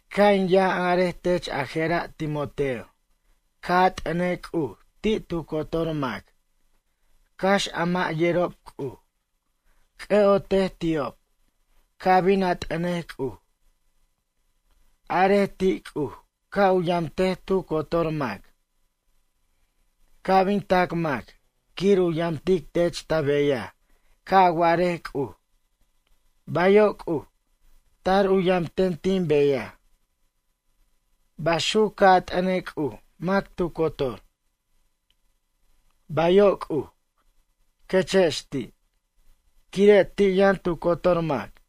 Ca' in yʌn arej tech ajera' Timoteo, ca' a t'ʌnej C'uj ti' tu cotor mac, cax a mʌ' yerob C'uj. C'ʌ'otej ti'ob, ca' bin a t'ʌnej C'uj. Arej ti' C'uj ca' u yamtej tu cotor mac. Ca' bin tac mac quir u yamtic tech ta beyaj ca' a warej C'uj: ―Bayo' C'uj, tar u yamten tin beyaj. Baxuc ca' a t'ʌnej C'uj mac tu cotor: ―Bayo' C'uj, quechex ti', quire' ti' yʌn tu cotor mac.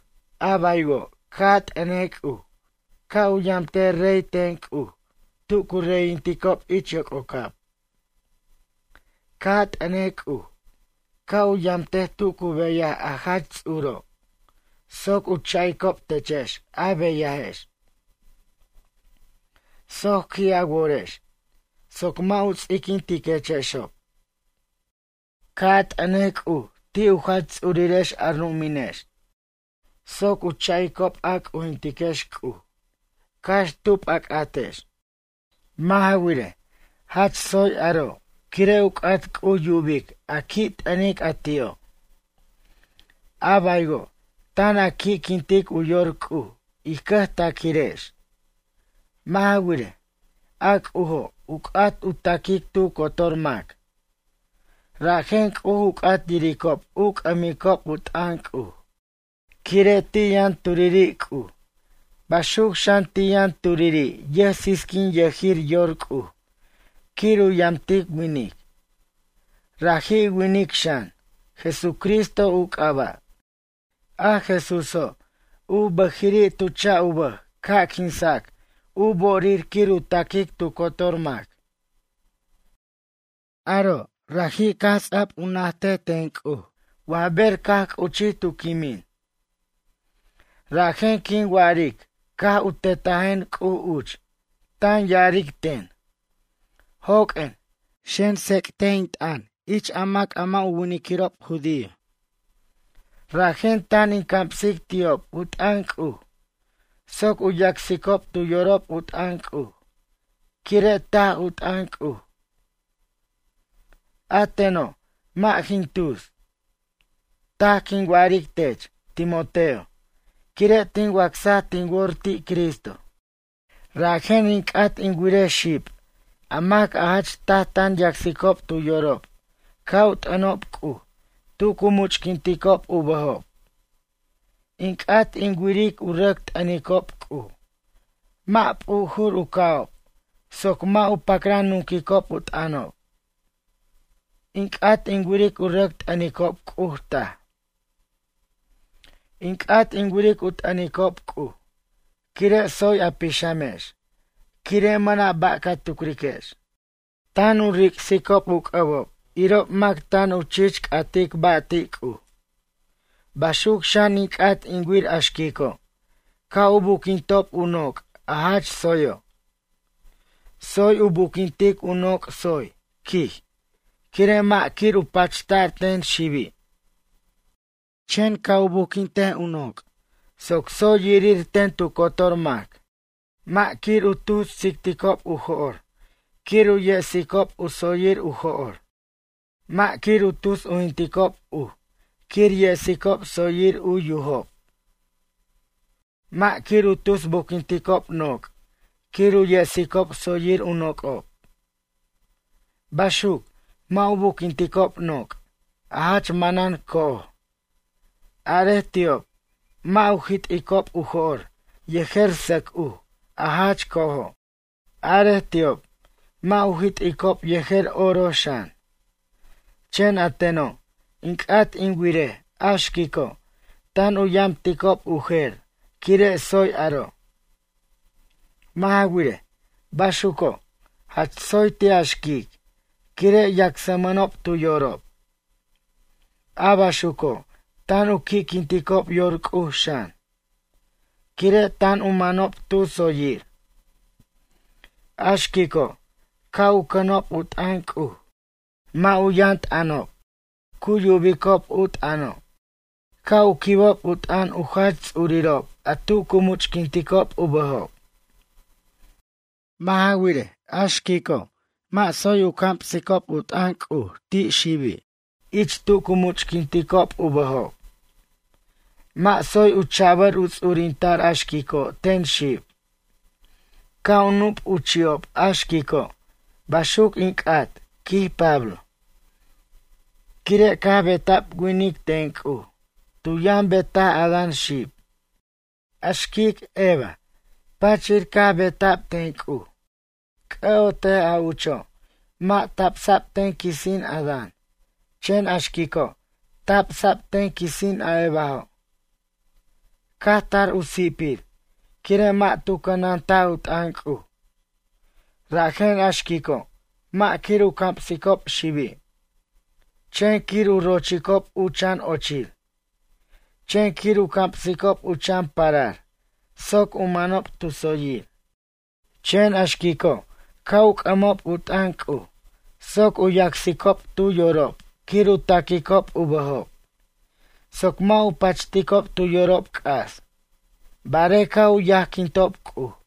A baywo' ca' a t'ʌnej C'uj ca' u yamtej rey ten C'uj tu cu reyinticob ich yoc'ocab. Ca' a t'ʌnej C'uj ca' u yamtej tu cu beyaj a jach ts'uro', soc u cha'icob techex a beyajex. Soc qui' a worex, soc mʌ' u ts'iquintiquechexob. Ca' a t'ʌnej C'uj ti' u jach ts'urirex a ru'uminex soc u cha'icob a c'ujintiquex C'uj cax tub a c'atex. Mʌ' ja wirej, jach tsoy aro' quire' u c'at C'uj yubic a qui' t'ʌnic a ti'o'. A baywo' tan a qui'quintic u yor C'uj ij cʌjtaquirex. Mʌ' ja wirej, a C'ujo' u c'at u taquic tu cotor mac. Rajen C'uj u c'at yiricob u c'ʌmicob u t'ʌn C'uj. Quire' ti' yʌn turiri' C'uj baxuc xan ti' yʌn turiri' yʌjsisquinyʌjir yor C'uj quir u yamtic winic. Raji' winic xan, Jesucristo u c'aba'. A Jesúso' u bʌjiri' tu cha' u bʌj ca' quinsac u bo'orir quir u taquic tu cotor mac. Aro' raji' caj u ts'a'b u najtic ten C'uj wa ber caj c'uchij tu quimin. Rajen quin wa'aric caj u tetajen C'uj uch tan ya'aric ten: ―Joq'uen, xen, tsec't in t'ʌn ich a mac a mʌ' u winiquirob judío. Rajen tan in camsic ti'ob u t'ʌn C'uj soc u yacsicob tu yorob u t'ʌn C'uj quire' taj u t'ʌn C'uj. A teno' mʌ' jin tus. Taj quin wa'aric tech, Timoteo, quire' tin wacsaj tin wor ti' Cristo. Rajen in c'at in wirej xib a mac a jach taj tan yacsicob tu yorob ca' u t'ʌnob C'uj tu cu much'quinticob u bʌjob. In c'at in wiric u rʌc t'ʌnicob C'uj mʌ' p'ujur u ca'ob soc mʌ' u pacran nunquicob u t'ʌnob. In c'at in wiric u rʌc t'ʌnicob C'uj taj. In c'at in wiric u t'ʌnicob C'uj quire' tsoy a pixamex quire' mʌna' ba' ca tucriquex. Tan u ric'sicob u c'ʌbob irob mac tan u chich c'atic ba' ti' C'uj. Baxuc xan in c'at in wir a xquico' ca' u buquintob u noc' a jach tsoyo'. Tsoy u buquintic u noc' tsoy, quij, quire' mʌ' quir u pachta'r ten xibi'. Chen ca' u buquint u noc' soc tsoy yirir ten tu cotor mac. Mʌ' quir u tus tsic'ticob u jo'r quir u yesicob u tsoyir u jo'r. Mʌ' quir u tus ujquinticob uj quir yesicob tsoyir u yujob. Mʌ' quir u tus buquinticob noc' quir u yesicob tsoyir u noc'ob. Baxuc, mʌ' u buquinticob noc' a jach manan co'oj. Arej ti'ob mʌ' u jit'icob u jo'r yejer sʌc uj a jach co'ojo'. Arej ti'ob mʌ' u jit'icob yejer oro xan. Chen a teno' in c'at in wirej a xquico' tan u yamticob u jer quire' tsoy aro'. Mʌ' ja wirej, baxuco' jach tsoy ti' a xquic quire' yacsmʌnob tu yorob. A baxuco' tan u qui'quinticob yor C'uj xan, quire' tan u manob tu tsoyir. A xquico' ca' u cʌnob u t'ʌn C'uj. Mʌ' u yʌn t'ʌnob cu yubicob u t'ʌno' ca' u quibob u t'ʌn u jach ts'urirob a tu cu much'quinticob u bʌjob. Mʌ' ja wirej, a xquico' mʌ' tsoy u camsicob u t'ʌn C'uj ti' xibi' ich tu cu much'quinticob u bʌjob. Mʌ' tsoy u cha'bʌr u ts'urinta'r a xquico' ten xib. Ca' u nup u chi'ob a xquico'. Baxuc in c'at, quij Pablo. Quire' caj beta'b winic ten C'uj, tu yʌn betaj Adán xib. A xquic Eva, pachir caj beta'b ten C'uj. C'ʌ'otej a ucho' mʌ' tabsa'b ten quisin Adán chen a xquico' tabsa'b ten quisin a Evajo'. Caj tar u si'pir quire' mʌ' tu cʌnantaj u t'ʌn C'uj. Rajen a xquico' mʌ' quir u camsicob xibi'. Chen quir u rochicob u chan ochir. Chen quir u camsicob u chan parar soc u manob tu tsoyir. Chen a xquico' ca' u c'ʌmob u t'ʌn C'uj soc u yacsicob tu yorob quir u taquicob u bʌjob, soc mʌ' u pachticob tu yorob c'as barej ca' u yajquintob C'uj.